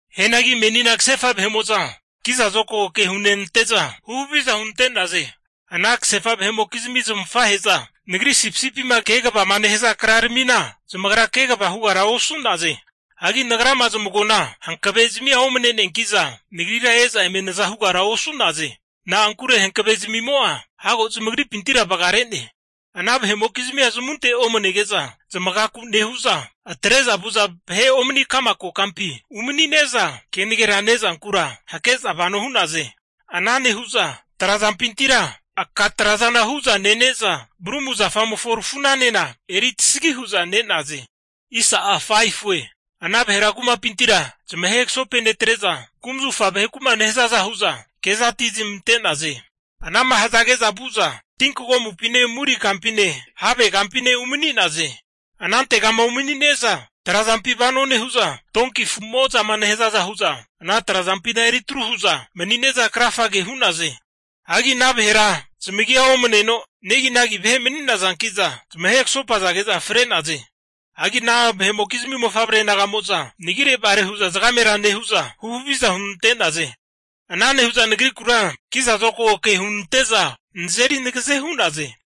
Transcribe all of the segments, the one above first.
Hianagi menina kasefa vahe'mo'za kiza zokago ke hunenante'za huhaviza hunante'naze. Ana kasefa vahe'mokizmi zamafahe'za nagri sipisipima kegavama nehaza kraramina zamagra kegava hugara osu'naze. Hagi nagrama zamagoana hankave'zamia omane'neanki'za nagrira e'za eme naza hugara osu'naze. Na'ankure hankavezmimo'a hago zamagripintira vagare'ne. Ana vahe'mokizmia zamunte omanege'za, zamagaku nehu'za atre'za vu'za vahe omani ka'ma kokampi umani'ne'za, kenagera ne'zankura hake'za vano hu'naze. Ana nehu'za trazampintira aka tra'zana hu'za nene'za, brumu zafamofo rafu'na'anena eri tasagi hu'za ne'naze. Ana vahera kumapintira zamahe kasopenetre'za, kumzufa vaheku'ma nehazaza hu'za kezatizmante'naze. Ana'ma hazage'za vu'za, tinkagomupine muri kampine, have kampine umani'naze. Anantegama umani'ne'za trazampi vano nehu'za, donki afu'mo'zama nehazaza hu'za ana trazampina eri tru hu'za mani'ne'za krafage hu'naze. Hagi ana vahera zamagia omaneno neginagi vahe mani'nazanki'za zamahe kasopazage'za fre'naze. Hagi ana vahe'mokizmi mofavre naga'mo'za, nagirevare zagamera nehu'za, huhaviza hunante'naze. Ana nehu'za nagrikura kiza zokago ke hunante'za, nazeri nagaze hu'naze.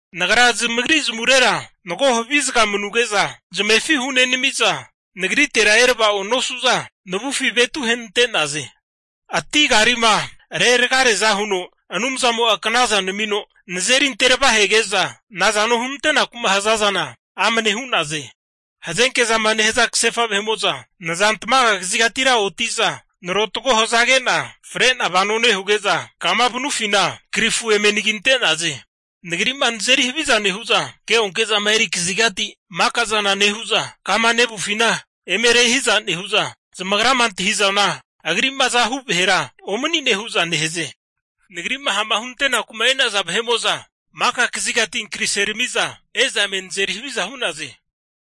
Nagra zamagri zamavurera mago havi zaga manuge'za zamefi hunenami'za, nagritera erava'o nosu'za, navufi zamavetu ahenante'naze. Ati karima reragareaza huno Anumzamo'a knaza namino nazeri ante ravahege'za, nazano hunante'naku'ma haza zana amne hu'naze. Hazenke zama nehaza kasefa vahe'mo'za nazantmaga kazigatira oti'za, narotago hazage'na fre'na vano nehuge'za, kama vanufina krifu eme anaginte'naze. Nagri'ma nazeri haviza nehu'za keonke'zama eri kazigati maka zana nehu'za, kama nevufina eme rehiza nehu'za, zamagrama antahi'zana agri'ma azahu vahera omani'ne hu'za nehaze. Nagri'ma ha'ma hunantenaku'ma e'nazana vahe'mo'za, maka kazigati ankariserami'za e'za eme nazeri haviza hu'naze.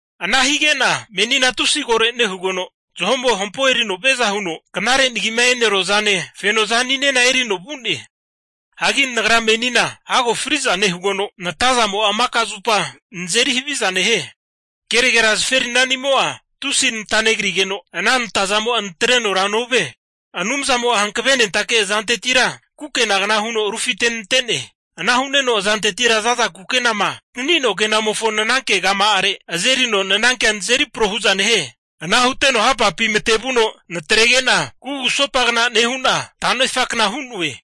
Ana hige'na menina tusi koro nehugeno, zaho'mo hampo erino viaza huno knare nagima e'neruazane fenozaninena erino vu'ne. Hagi nagra menina hago fri'za nehugeno, natazamo'a maka zupa nazeri haviza nehie. Kenagera zaferinanimo'a tusi nata negrigeno, ana natazamo'a naterenora novie. Anumzamo'a hankavenentake azantetira kukenagna huno rufitenante'ne. Ana hu'neno azantetira za'za kukenama antaninoa kenamofo nananke kama'are azerino nanankena nazeri pro hu'za nehie. Ana huteno hapapi matevuno natrege'na, kugusopagna nehu'na tanefakna hu'noe.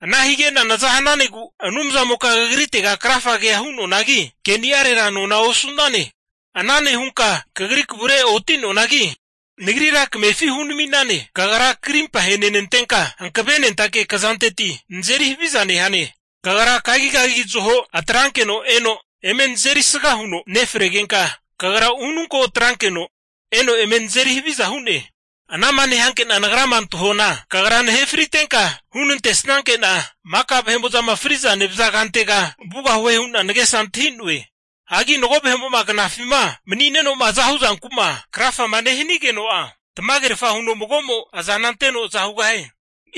Ana hige'na naza hananegu Anumzamoka kagritega krafagea hu'noanagi, keni'arera nona osu'nane. Ana nehunka kagri kavure oti'noanagi, nagrira kamefi hunami'nane. Kagra karimpa ahenenantenka, hankavenentake kazanteti nazeri haviza nehane. Kagra kagigagi zaho atrankeno eno eme nazeri sga huno nefregenka, kagra ununko atrankeno eno eme nazeri haviza hu'ne. Ana'ma nehanke'na nagrama antahuana, kagra nahe fritenka hunantesnanke'na maka vahe'mo'zama fri'za nevaza kumatega vugahue hu'na nagesa antahi'noe. Hagi mago vahe'mo'ma knafima mani'neno'ma azahu zanku'ma krafama nehanigeno'a, tamagerfa huno mago'mo azana anteno aza hugahie.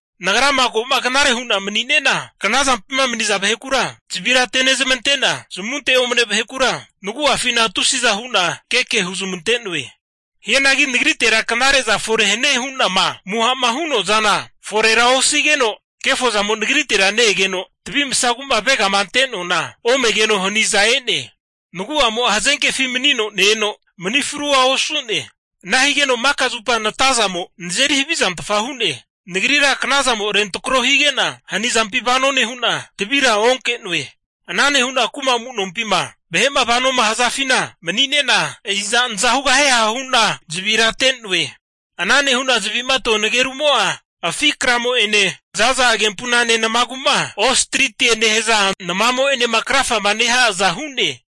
Nagrama ko'ma knare hu'na mani'ne'na, knazampima mani'za vahekura zavira atenezmante'na, zamunte omane vahekura nagu'afina tusiza hu'na keke huzmante'noe. Hianagi nagritera knare'za fore hanie hu'nama amuha'ma hu'noa zana forera osigeno, kefo zamo nagritera ne-egeno, tavi masagu'ma avegama ante'noana omegeno hanizamo e'ne. Nagu'amo'a hazenkefi manino ne-eno mani frua osu'ne. Ana higeno maka zupa natazamo nazeri havizantfa hu'ne. Nagrira knazamo rentrako higena hanizampi vano nehu'na, tavira onke'noe. Ana nehu'na kuma amu'nompima vahe'ma vano nehazafi mani'ne'na, iza naza hugahieha nehu'na zavira ate'noe. Ana nehu'na zavi'matoa nagerumo'a, afi kramo'ene za'za agempunane namagu'ma ostritiema nehaza namamo'enema krafama neha'aza hu'ne.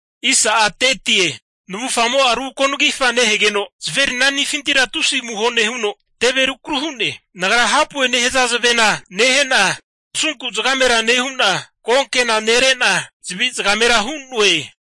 Navufgamo'a ru ko'nagifa nehegeno, zaferinanifintira tusi amuho nehuno teve rukaru hu'ne. Nagra hapue nehaza zavena nehe'na, nasunku zagamera nehu'na, konkena nere'na zavi zagamera hu'noe.